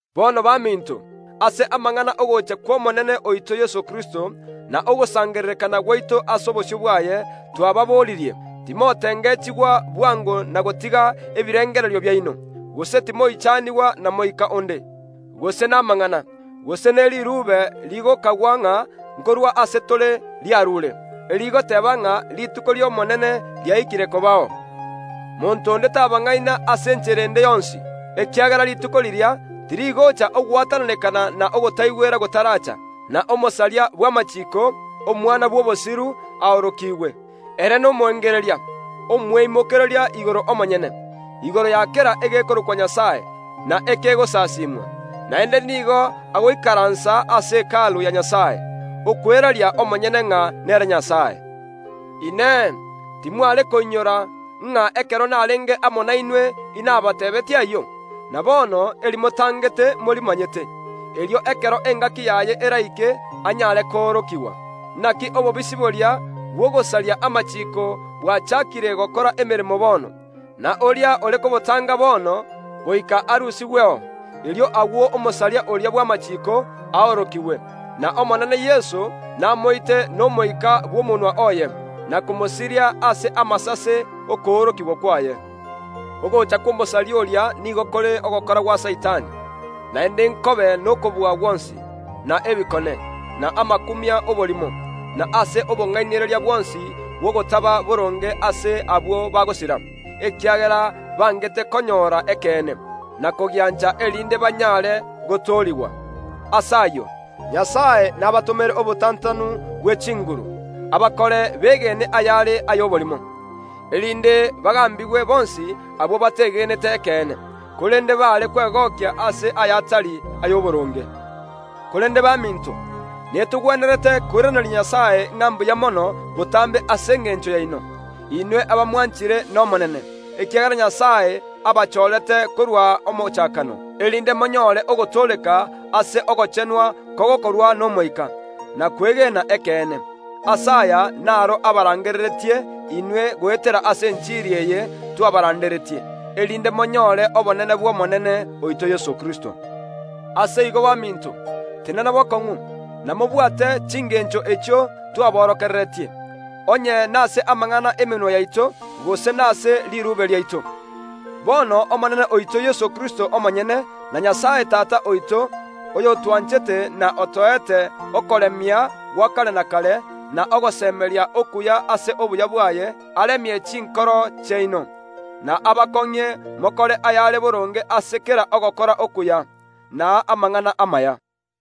Bono baminto, ase amang’ana y’ogocha kw’Omonene oito Yeso Kristo, na ogosangererekana gwaito ase obosio bwaye, twababoririe, timotengechigwa bwango na gotiga ebirengererio biaino, gose timoichanigwa na moika onde, gose namang’ana, gose ne riruube rigokagwa ng’a nkorwa ase tore riarure, erigoteeba ng’a rituko ri’Omonene riaikire kobao. Monto onde tabang’aina ase enchera ende yonsi, ekiagera rituko riria tirigocha ogwatananekana na ogotaigwera gotaracha, na omosaria bw’amachiiko, omwana bw’obosiru, aorokigwe. Ere nomoengereria, omweimokereria igoro omonyene, igoro ya kera egekorokwa Nyasae, na ekegosasimwa. Naende nigo agoikaransa ase Hekalu ya Nyasae, okweraria omonyene ng’a nere Nyasae. Inee! Timware koinyora ng’a ekero narenge amo nainwe inabateebeetie ayio? Na bono, erimotangete morimanyete, erio ekero engaki yaye eraike anyare koorokigwa. Naki obobisi boria bw’ogosaria amachiiko bwachaakire gokora emeremo bono, na oria ore kobotanga bono goika arusigweo. Erio agwo omosaria oria bw’amachiiko aorokigwe, n’Omonene Yeso namoite n’Omoika bw’omonwa oye, na komosiria ase amasase ’okoorokigwa kwaye. Ogocha kw’omosaria oria nigo kore ogokora gwa Saitani, naende nkobe nokobua gwonsi, na ebikone, na amakumia y’oborimo, na ase obong’ainereria bwonsi bw’ogotaba boronge ase abwo bagosira, ekiagera bangete konyora ekeene, na kogiancha erinde banyare gotoorigwa. Ase ayio, Nyasae nabatomere obotantanu bw’echinguru, abakore begene ayare ay’oborimo, erinde bagambigwe bonsi abwo bateegenete ekeene, korende baare kwegokia ase ayatari ay’oboronge. Korende baminto, netogwenerete koiraneria Nyasae ng’a mbuya mono botambe ase engencho yaino, inwe abamwanchire n’Omonene, ekiagera Nyasae abachorete korwa omochakano, erinde monyore ogotooreka ase ogochenwa kogokorwa n’Omoika, na kwegena ekeene. Ase aya naro abarangereretie inwe goetera ase enchiri eye twabaranderetie, erinde monyore obonene bw’Omonene oito Yeso Kristo. Ase igo baminto, tenena bokong’u, na mobwate chingencho echio twaborokereretie, onye nase amang’ana y’emenwa yaito, gose nase riruube riaito. Bono Omonene oito Yeso Kristo omonyene, na Nyasae Tata oito, oyotwanchete na otoete okoremia gwa kare na kare, na ogosemeria okuya ase obuya bwaye, aremie chinkoro chiaino, na abakong’ie mokore ayare boronge ase kera ogokora okuya, na amang’ana amaya.